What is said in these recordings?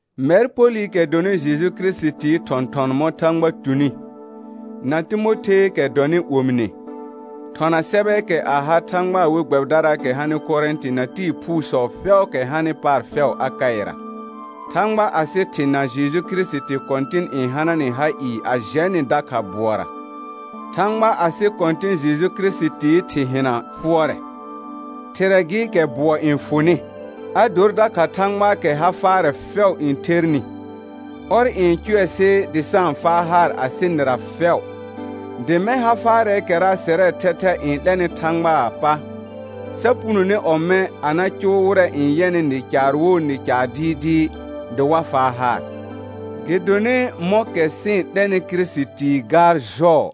Mɛr Polɩkɛ dɔnɩ Jeju Kirisitii thɔ̃thɔn mɔ̃ Thãgba tuni, na Timotheekɛ dɔnɩ omine, thɔna sɛbɛɛkɛ a ha Thãgbaa we gbɛbɩdaraakɛ hanɩ Korɛ̃tɩ na tɩɩ phuusɔ fɛʋʋkɛ hanɩ paar fɛʋ Akaɩra. Thãgba asɩ Thɩ na Jeju Kirisiti Kɔ̃tɩn n hana nɩ ha ɩɩ a jɛ nɩ dakha bʋɔra. Thãgba asɩ Kɔ̃tɩ̃ Jeju Kirisitii Thɩ hɩna fʋɔrɛ, Thɩrɛ gɩ kɛ bʋɔ n fʋnɩ, a dor dakha Thãgbaakɛ ha faarɛ fɛʋ n thernɩ. Ɔr n cʋɛ sɩ dɩ sa-n faa haar asɩ nɩra fɛʋ, dɩ mɛ̃ ha faarɛɛkɛra sɛrɛɛ thɛthɛ n 'lɛnɩ Thãgbaa pa, sa punone ɔmɛ̃ a na cʋʋ wɩrɛ n yɛnɩ nɩ caar wo nɩ caar dɩɩdɩɩ, dɩ wa faa haar. Gɩdonɩ mɔ̃kɛ sɩ-n 'lɛnɩ Kirisitii gaar jɔɔ,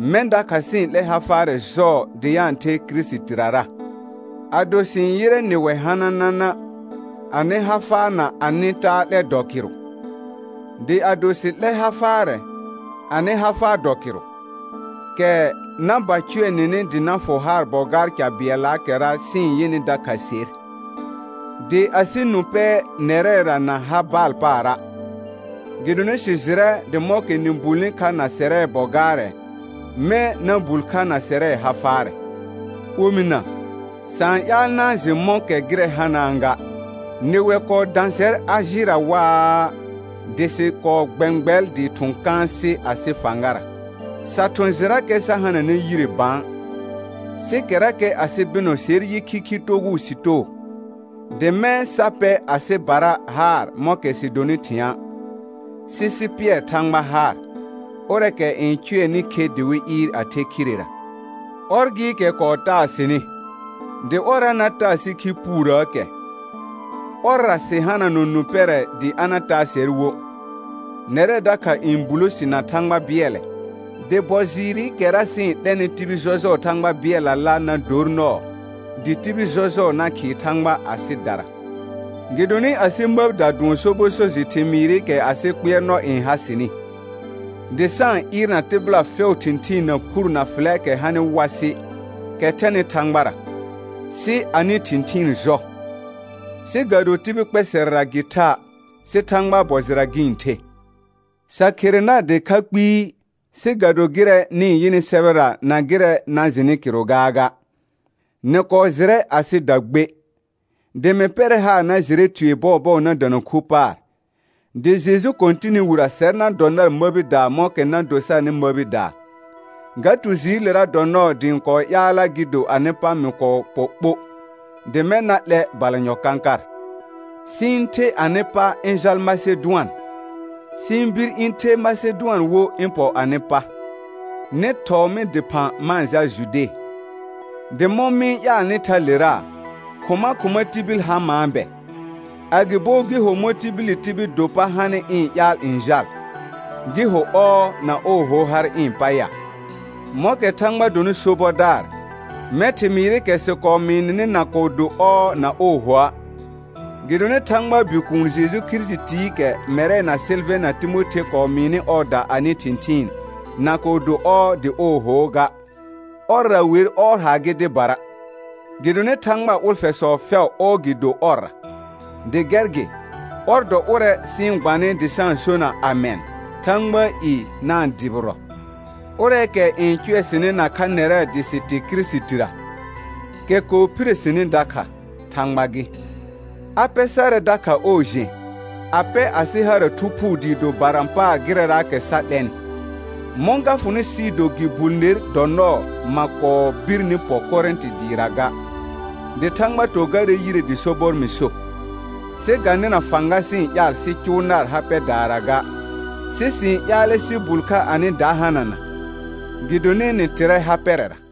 mɛ̃ dakha sɩ-n 'lɛ ha faarɛ jɔɔ dɩ a-n the Kirisitirara. Ado sɩ-n yɩrɛ nɩwɛ hananana, anɩ ha faa na anɩ taa 'lɛ dɔ kɩrʋ; dɩ ado sɩ 'lɛ ha faarɛ, anɩ ha faa dɔ kɩrʋ, kɛ na ba cʋɛ nɩnɩ dɩ na fʋ haar bɔ gaar ca bɩɛllaakɛra sɩ-n yɩnɩ dakha ser. Dɩ asɩ nũ pɛ nɛrɛra na ha baal paara', gɩdonɩ sɩ jɩrɛ dɩ mɔ̃kɛ nɩ bulni kha na sɛrɛ bɔ gaarɛ, mɛ̃ na bul kha na sɛrɛ ha faarɛ. Omɩna, sa-n ƴaal na-n jɩ mɔ̃kɛ gɩrɛ hanaa ga: Nɩwɛ kɔɔ dã sɛr Ajɩra waa, dɩ sɩ kɔɔ gbɛ̃gbɛl dɩɩ thʋ̃ kãasɩ asɩ fãgara, sa thʋ̃ jɩrakɛ sa hananɛ yire bã. Sɩ kɛrakɛ asɩ bɩnɔ ser yɩ khikhi togʋʋ sɩ too, dɩ mɛ̃ sa pɛ asɩbara haar mɔ̃kɛ sɩ donɩ thɩ̃a', sɩ sɩ pɩɛr Thãgba haar, ʋrɛɛkɛ n cʋɛnɩ khe dɩ wɩ ɩɩr a the khirera. Ɔr gɩɩkɛ kɔɔ taa sɩnɩ, dɩ ɔrra na taa sɩ khi puurəəkɛ; ɔrra sɩ hananɔ nũ pɛrɛ dɩ a na taa sɛr wo. Nɛrɛ dakha n bulo si na Thãgba bɩɛlɛ, dɩ bɔ jɩɩrɩkɛra sɩ-n 'lɛnɩ tibil jɔjʋɔɔ Thãgba bɩɛllala na dor nɔɔ, dɩ tibil jɔjʋɔ na khɩɩ Thãgba asɩdara. Gɩdonɩ asɩ məbida dʋɔn sobɔ so jɩ thɩmɩɩrɩkɛ asɩ kpɩɛrnɔ n ha sɩnɩ, dɩ sa-n ɩɩrna tɩbɩla fɛʋʋ thɩ̃thɩɩn na phur na fɩlɛɛkɛ hanɩ wasɩ, kɛ thɛnɩ Thãgbara, sɩ anɩ thɩ̃thɩɩn jɔ; sɩ ga do tibil kpɛsɛrɛra gɩ tha', sɩ Thãgbaa bɔ jɩra gɩ-n the. Sa khere nar dɩkha kpɩɩ, sɩ ga do gɩrɛ nɩ-n yɩnɩ sɛbɛra na gɩrɛɛkɛ na jɩnɩ kɩrʋ gaaga. Nɩ kɔɔ jɩrɛ asɩda gbe, dɩ mɩ pɛrɛ haar na jɩrɛ tue bɔɔbɔɔ na dana khu paar, dɩ Jeju Kɔ̃tɩnɩ wirə sɛr na dɔ nar məbidaa mɔ̃kɛ na do sarnɩ məbidaa. Ga tu jɩɩlera dɔ nɔɔ dɩ ɩ̃ kɔɔ ƴaalla gɩ do anɩ pa mɩ kɔɔ pɔ ɓo, dɩ mɛ̃ na 'lɛ balanyɔ kãkar, sɩ ɩ̃ the anɩ pa ɩ̃ jal Masedʋan, sɩ ɩ̃ bir ɩ̃ the Masedʋan wo ɩ̃ pɔ anɩ pa, nɩ thɔɔ mɩ dɩphã ma-n jal Jude. Dɩ mɔ̃ mɩ-n ƴaalnɩ thalera, khʋma khʋma tibil ha maa bɛ? Agɩbo gɩ ho mɔ̃ tibili tibil do pa hanɩ ɩ̃ ƴaal n jal, gɩ ho «ɔɔ» na «ooho» har ɩ̃ pa ya? Mɔ̃kɛ Thãgba donɩ sobɔdaar, mɛ̃ thɩmɩɩrɩkɛ sɩ kɔɔ mɩɩ nɩnɩ na kɔɔ do «ɔɔ» na «oohoa'.» Gɩdonɩ Thãgbaa Bikuun Jeju Kirisitiikɛ mɛrɛ na Sɩlvɛ̃ na Timothe kɔɔ mɩɩnɩ ɔɔda anɩ thɩ̃thɩɩn, na kɔɔ do «ɔɔ» dɩ «ooho» ga, ɔrra wer «ɔɔ» haar gɩ dɩbara. Gɩdonɩ Thãgbaa ʋlfɛsɔ fɛʋ «ɔɔ» gɩ do ɔrra. Dɩ gɛr gɩ, ɔr dɔ ʋrɛ sɩ-n gbanɩ dɩ sa-n sona «amɛn» Thãgbaa i na-n dʋbɩrɔ. Ʋrɛɛkɛ n cʋɛ sɩnɩ nakha nɛrɛ dɩ sɩ tɩ Kirisitira, kɛ kɔɔ phire sini dakha, Thãgba gɩ. A pɛ sarɛ dakha ɔɔ jẽ, a pɛ asɩ hara Thu Phuu dɩ do barã paar gɩrɛraakɛ sa 'lɛnɩ. Mɔ̃ ga fʋnɩ sɩɩ do gɩ bul ner dɔ nɔɔ ma kɔɔ birni pɔ Korɛ̃tɩ dɩɩra ga, dɩ Thãgba to garɛ yire dɩ sobɔr mɩ so. Sɩ ga nɩna fãga sɩ-n ƴaal sɩ cʋʋ nar ha pɛdaara ga, sɩ sɩ-n ƴaalɛ sɩ bul kha anɩ da hanana, gɩdonɩ nɩ tɩrɛ ha pɛrɛra.